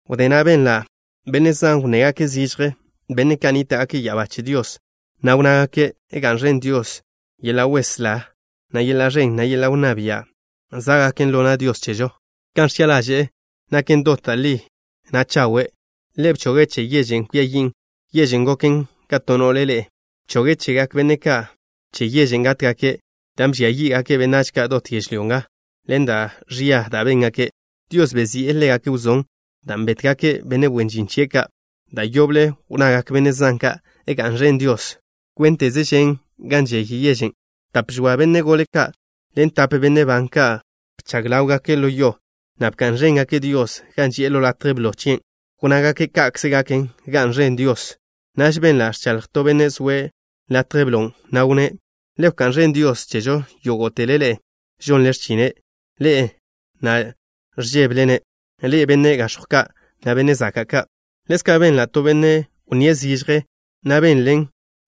Wdé na' benla' benne' zan wnnégake' zižje, benne' ka' nníta'gake' ya'abá che Dios, na' wnnágake': ¡Ga'n ẕen Dios! ¡Yeḻa' weslá, na' yeḻa' ẕen, na' yeḻa' wnná bia' zá'gaken ḻo na' Dios chežo! Kan ẕchi'a ḻaže'e naken dot da' li, na' chawe'. Ḻe' bchoge' che yežen' kwia yin', yežen' goken ka to no'le ḻe'e. Bchoge' chegak benne' ka' che yežen' gátgake', dan' bžia yí'gake' benách ka' dot yežlyó nga, ḻen da' ẕia da' béngake'. Dios bezi'e ḻégake' wzón dan' bétgake' benne' wen žin chie' ka'. Da' yoble wnnagak benne' zan ka': ¡Ga'n ẕen Dios! Kwénteze žen gan žey yežen'. Tap žoa benne' gole ka' ḻen tape benne' ban ka' bchag ḻáwgake' ḻo yo, na' bka'n ẕéngake' Dios, gan ži'e ḻo latje blo chien'. Wnnágake': “¡Ka'kze gaken! ¡Ga'n ẕen Dios!” Naž benla' ẕchaḻj to benne' zoe' latje blon', na' wnné': ¡Le wká'n ẕen Dios chežo yógo'tele ḻe'e, žonle x̱chine', ḻe'e na' ẕžébele-ne', ḻe'e, benne' gax̱jw ka', na' benne' zaka' ka'! Ḻezka' benla' to benne' wnníe' zižje, na' benlen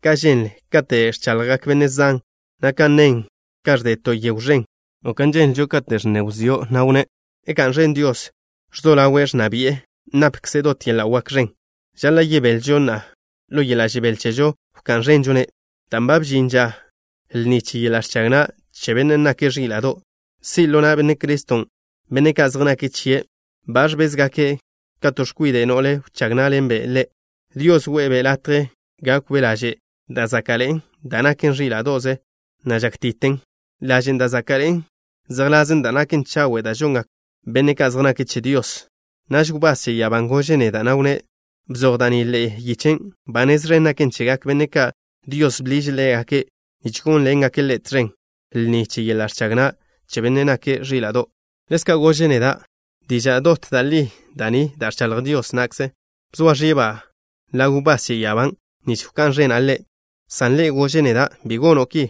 kan ženlen kate' ẕchaḻjgak benne' zan, na' kan ženlen gan ẕde to yegw ẕen, o kan ženlen kate' ẕnne wzió', na' wnné': ¡Ga'n ẕen Dios! ¡Ẕzo ḻawe' ẕnna bi'e! ¡Napkze' dot yeḻa' wak ẕen! Žaḻa' yebelžo na' ḻo yeḻa' žebél chežo wká'n ẕenžo-ne' dan' ba bžin ža lni che yeḻa' ẕchag na' che Bennen' nake' Ẕíla'do'. Si' ḻo na' Benne' Criston' benne' ka' zej nake' chie'. Ba ẕbézgake' ka to x̱kwide' no'le wchág ná'ḻenbe' Ḻe'. Dios we'e-be' latje gákwbe' laže' da' záka'ḻe'en, da' naken ẕíla'do'ze, na' žákti'ten. (Lažen' da' záka'ḻe'en zejḻasen da' naken chawe' da' žongak benne' ka' zej nake' che Dios.) Naž wbás che ya'abán' gože' neda', na' wnné': “Bzoj da' ni ḻe'e yiche: Ba nez ẕen gaken chegak benne' ka' Dios bḻiže' ḻégake' nich gónḻengake' Ḻe' tẕen lni che yeḻa' ẕchag na' che Bennen' nake' Ẕíla'do'.” Ḻezka' gože' neda': “Diža' dot da' li da' ni da' ẕchaḻj Dios na'kze.” Bzoa ẕiba' ḻaw wbás che ya'abán' nich wká'n ẕena' ḻe', san ḻe' gože' neda': “Bi gono' ki.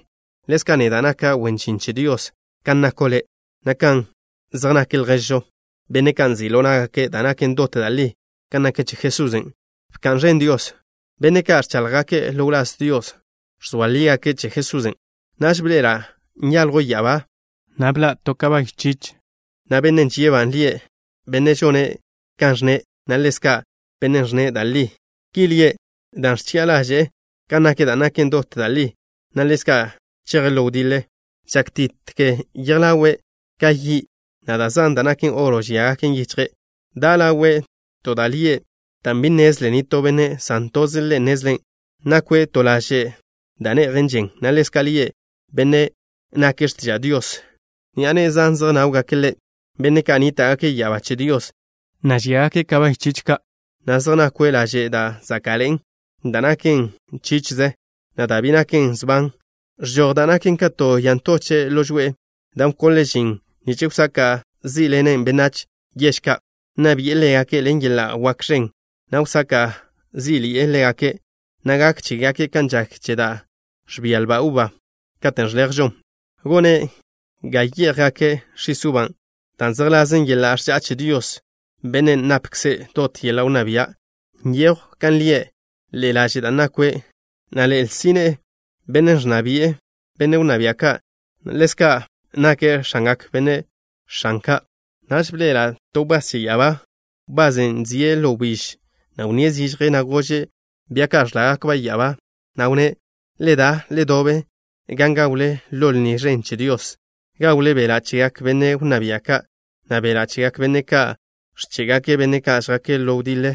Ḻezka' neda' naka' wen žin che Dios kan nako' le', na' kan zej nak lježo', benne' ka' nzi' ḻo ná'gake' da' naken dot da' li kan nak che Jesusen'. ¡Bka'n ẕen Dios!” Benne' ka' ẕcháḻjgake' ḻo wláz Dios, ẕzoa lígake' che Jesusen'. Naž bḻe'ela' nyaljw ya'abá, na' bḻa' to bia chich, na' Benne' žie'-ba' lie' Benne' Žone' Kan Ẕnne', na' ḻezka' Benne' Ẕnne' Da' Li. Ki lie' dan' ẕchi'a ḻaže'e kan nak da' naken dot da' li, na' ḻezka' cheje' ḻo wdiḻe. Žákti'te yej ḻawe' ka yi', na' da' zan da' naken oro žíagaken yichje'. Da' ḻawe' to da' lie', dan' bi nnezlen nitó benne', san toze' Ḻe' nnezlen'. Nakwe' to laže' da' ne'jen žen, na' ḻezka' lie' Benne' Nake' X̱tiža' Dios. Ni'a ne'e zan zejnáwgake' Ḻe', benne' ka' nníta'gake' ya'abá che Dios, na' žíagake' bia chich ka', na' zej nakwe' laže' da' záka'ḻe'en, dan' naken ẕíla'do'ze, na' dan' bi naken sban. Ẕžoj da' naken ka to ya ntoche' ḻo žoe'e, dan' wkonle' žin nich wsaka' zí'ḻenen' benách yež ka'. Nna bi'e ḻégake' ḻen yeḻa' wak ẕen, na' wsaka' zí'ḻi'e ḻégake', na' gak chégake' kan žak che da' ẕbia lba uba, katen' ẕlejžon. Gone' ga yé'jgake' x̱is uban' da' zejḻasen yeḻa' ẕža'a che Dios, Bennen' napkze' dot yeḻa' wnná bia'. Nyejw kan lie' ḻe'e laže' da' nakwe', na' ḻe'e lsine'e, Benne' Ẕnna Bi'e Benne' Wnná Bia' Ka', na' ḻezka' Benne' Nake' X̱angak Benne' X̱an Ka'. Naž bḻe'ela' to wbás che ya'abá, wbasen' zie' ḻo wbíž, na' wnníe' zižje, na' gože' bia ka' ẕḻágakba' ya'abá, na' wnné': “Le da, le dobe gan gawle ḻo lni ẕen che Dios. Gawle beḻa' chegak benne' wnná bia' ka', na' beḻa' chegak benne' ka' ẕché'gake' benne' ka' žjake' ḻo wdiḻe,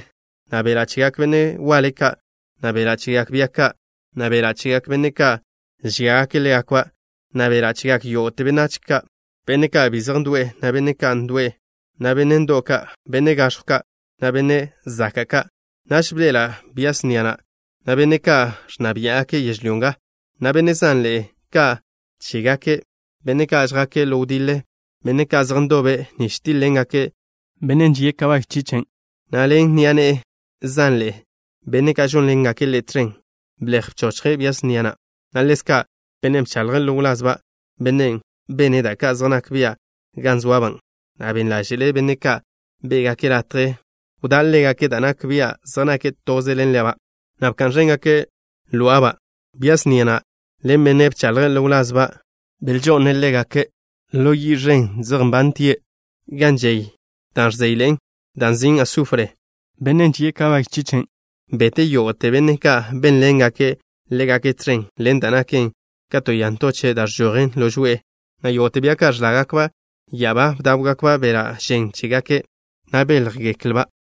na' beḻa' chegak benne' waḻe ka', na' beḻa' chegak bia ka', na' beḻa' chegak benne' ka' žíagake' ḻégakba', na' beḻa' chegak yógo'te benách ka', benne' ka' bi zej ndo'e, na' benne' ndo'w ka', benne' gax̱jw ka', na' benne' zaka' ka'.” Naž bḻe'ela' bia snia na', na' benne' ka' ẕnna biá'gake' yežlyó nga, na' benne' zanḻe'e ka' chégake', benne' ka' žjake' ḻo wdiḻe. Benne' ka' zej ndobe' nich tíḻ-ḻengake' Bennen' žie' bia chichen', na' ḻen ni'a ne'e zanḻe'e, benne' ka' žónḻengake' Ḻe' tẕen. Blej bchóchgake' bia snia na', na' ḻezka' bennen' bchaḻje' ḻo wlazba', bennen' bene' da' ka' zej nak bia' gan zoaba', na' ben ḻáže'le' benne' ka' bé'gake' latje wdá' ḻégake' da' nak bia' zej nake' toze ḻen leba', na' bka'n ẕéngake' ló'aba'. Bia snia na' ḻen bennen' bchaḻje' ḻo wlazba', belžo'ne' ḻégake' zej nbane' ḻo yi' ẕen gan žey da' ẕzéyḻe'en, dan' nzin' sufr. Bennen' žie' bia chichen' bete' yógo'te benne' ka' bénḻengake' ḻégake' tẕen ḻen da' naken ka to ya ntochen' dan' ẕžojen ḻo žoe'e, na' yógo'te bia ka' ẕḻágakba' ya'abá bdáwgakba' beḻa' žen chégake', na' béljgeklba'.